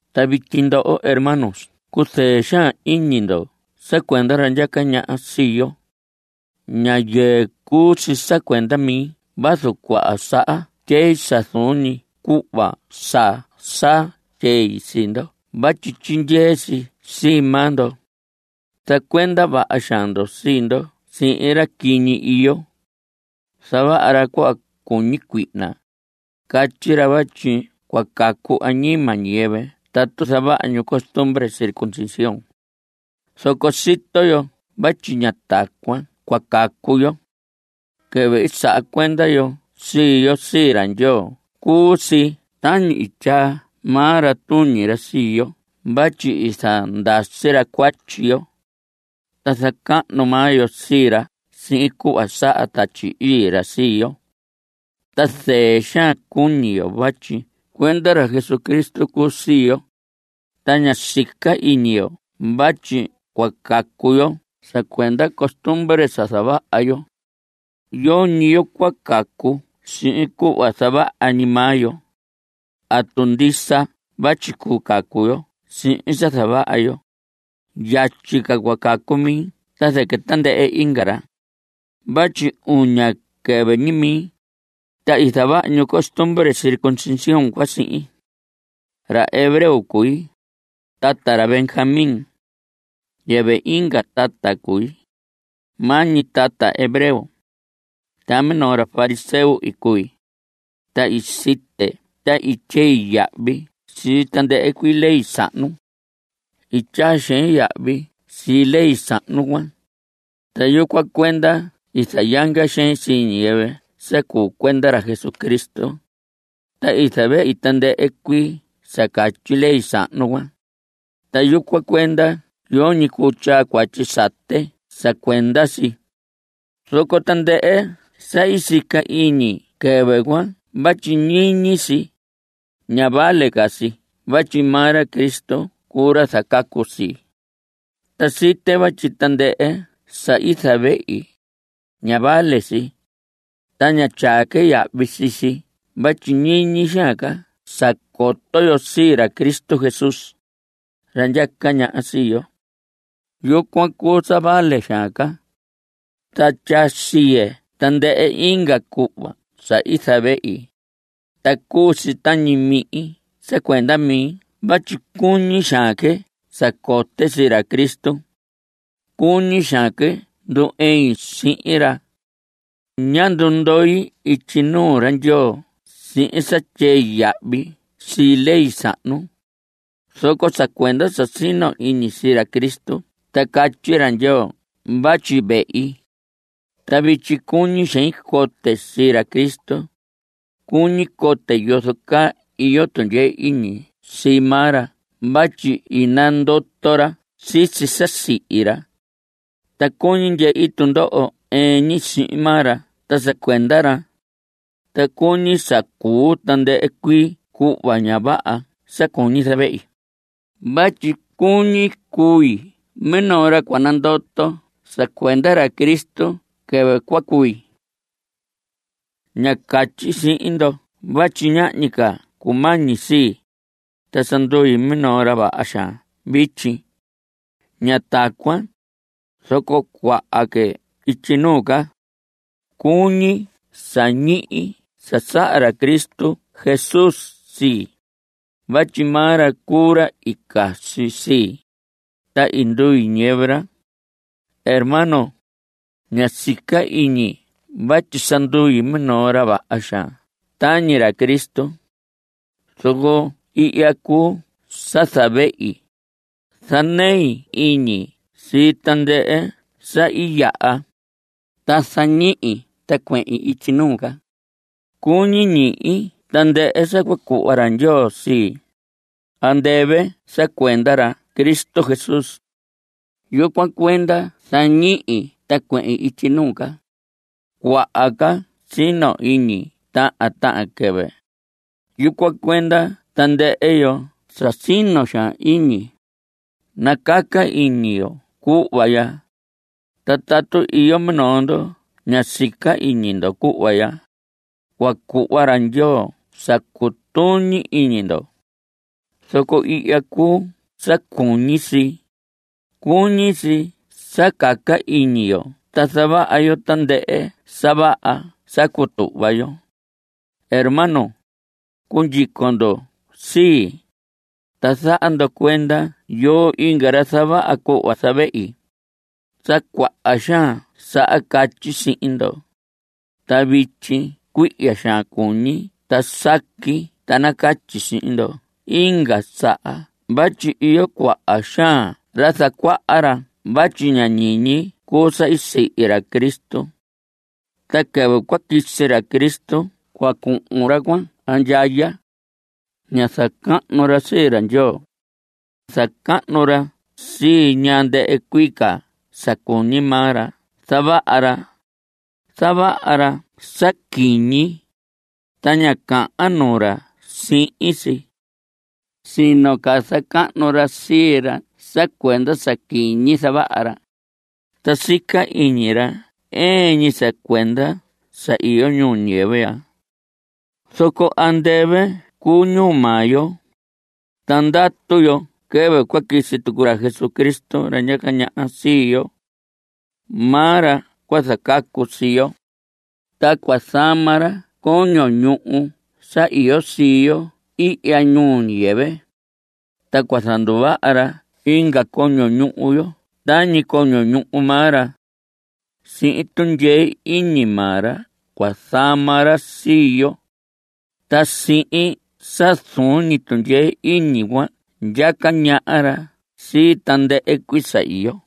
Ta vityi ndoho hermanos cuzɨɨ xaan iñi ndo sa cuenda ra ndyaca ñaha sii yo. Ña yɨɨ cuu si cuenda mi vazu cuaha saha tyei sa zuun ñi cuhva sa sa tyei sii ndo vatyi tyindyee si sii maa ndo. Zacuenda vaha xaan ndo sii ndo sihin ra quiñi iyo. Zavaha ra cuhva cuñi cuihna. Catyi ra vatyi cua cacu añima ñiyɨvɨ tatu zavaha ñu costumbre circuncisión. Zoco sito yo vatyi ña tacuan cua cacu yo. Quɨvɨ i saha cuenda yo sii yo sii ra Ndyoo cuu si tañi i tyaa maa ra tuñi ra sii yo vatyi i zandasi ra cuatyi yo. Ta zacahnu maa yo sii ra sihin cuhva saha Tatyi Ii ra sii yo. Ta zɨɨ xaan cuñi yo vatyi cuenda ra Jesucristo cuu sii yo. Ta ña sica iñi yo vatyi cua cacu yo sa cuenda costumbre sa zavaha yo. Yoñi yo cua cacu sihin cuhva zavaha ñi maa yo. Tatu ndisa vatyi cuu cacu yo sihin sa zavaha yo, yatyi ca cua cacu mi ta zɨquɨ tandɨhɨ inga ra vatyi uña quɨvɨ ñi mi, ta i zavaha ñu costumbre circuncisión cuan sihin. Ra hebreo cui, tata ra Benjamín. Yɨvɨ inga tata cui, maa ñi tata hebreo. Ta minoo ra fariseo i cui, ta i site ta i tyei yahvi sii tandɨhɨ cuii ley sahnu. I tyaa xein yahvi sii ley sahnu cuan, ta yucuan cuenda i zayanga xein sii ñiyɨvɨ sa cuu cuenda ra Cristo. Ta i zavehi tandɨhɨ cuii sa catyi ley sahnu cuan, ta yucuan cuenda yoñi cuu tyaa cuatyi sate sa cuenda si. Zoco tandɨhɨ sa i sica iñi quɨvɨ cuan vatyi ñiñi si, ña vale ca si vatyi maa ra Cristo cuu ra zacacu sii. Ta site vatyi tandɨhɨ sa i zavehi, ña vale si, ta ña tyaa que yahvi sii si vatyi ñiñi xaan ca sa coto yo sii ra Cristo Jesús, ra ndyaca ñaha sii yo. Yucuan cuu sa vale xaan ca. Ta tyaa siye tandɨhɨ inga cuhva sa i zavehi, ta cuu si tañi mihin sa cuenda mi vatyi cuñi xaan que sa cote sii ra Cristo. Cuñi xaan que ndu‑ɨin sihin ra. Ñá ndundoi ityi nuu ra Ndyoo sihin sa tyei yahvi sii ley sahnu, zoco sa cuenda sa sino iñi sii ra Cristo ta catyi ra Ndyoo vatyi vehi. Ta vityi cuñi xein cote sii ra Cristo. Cuñi cote yozo caa iyo tundyee iñi sii maa ra vatyi i nandoto ra sisi sa i sihi ra. Ta cuñi ndyehi tundoho ɨɨn ñi sihin maa ra ta sa cuenda ra. Ta cuñi sa cuu tandɨhɨ cuii cuhva ña vaha sa cuñi zavehi vatyi cuñi cui minoo ra cua nandoto sa cuenda ra Cristo quɨvɨ cua cui. Ña catyi sihin ndo vatyi ñahñi ca sa cumañi sii, ta sa ndui minoo ra vaha xaan vityi. Ña tacuan. Zoco cuahan que ityi nuu ca. Cuñi sa ñihi sa saha ra Cristo Jesús sii, vatyi maa ra cuu ra i casi sii, ta i ndui ñiyɨvɨ ra. Hermanos, ña sica iñi vatyi sa ndui minoo ra vaha xaan tañi ra Cristo. Zoco ihya cuu sa zavehi, zanei iñi sii tandɨhɨ sa i yaha, ta zañihi ta cuehin ityi nuu ca. Cuñi ñihi tandɨhɨ sa cua cuhva ra Ndyoo sii, andɨvɨ sa cuenda ra Cristo Jesús. Yucuan cuenda zañihi ta cuehin ityi nuu ca. Cuahan ca sino iñi tahan tahan quɨvɨ. Yucuan cuenda tandɨhɨ yo sa sino xaan iñi, nacaca iñi yo cuhva ya. Ta tatu iyo minoo ndo ña sica iñi ndo cuhva ya, cua cuhva ra Ndyoo sa cutuñi iñi ndo. Zoco ihya cuu sa cuñi si; cuñi si sa caca iñi yo ta zavaha yo tandɨhɨ sa vaha sa i cutuhva yo. Hermanos, cundyico ndo sii. Ta zaha ndo cuenda yoo inga ra zavaha cuhva zavehi. Sa cuaha xaan saha catyi sihin ndo, ta vityi cuihya xaan cuñi ta saqui ta nacatyi sihin ndo inga saha vatyi iyo cuaha xaan ra zacuaha ra vatyi ña ñiñi cuu sa i sihi ra Cristo. Ta quɨvɨ cua quisi ra Cristo cua cuhun ra cuan andyaya. Ña zacahnu ra sii ra Ndyoo. Zacahnu ra sii ñaa ndɨhɨ cuii ca sa cuñi maa ra zavaha ra. Zavaha ra sa quiñi, ta ña cahan nuu ra sihin si. Sino ca zacahnu ra sii ra sa cuenda sa quiñi zavaha ra. Ta sica iñi ra ɨɨn ñi sa cuenda sa iyo ñuu ñiyɨvɨ ya. Zoco andɨvɨ cuu ñuu maa yo, ta ndatu yo quɨvɨ cua quisi tucu ra Jesucristo, ra ndyaca ñaha sii yo. Maa ra cua zacacu sii yo. Ta cua zama ra coño ñuhu sa iyo sii yo ihya ñuu ñiyɨvɨ. Ta cua zanduvaha ra inga coño ñuhu yo tañi coño ñuhu maa ra. Sihin tundyee iñi maa ra cua zama ra sii yo. Ta sihin sa zuun ñi tundyee iñi cuan ndyaca ñaha ra sii tandɨhɨ cuii sa iyo.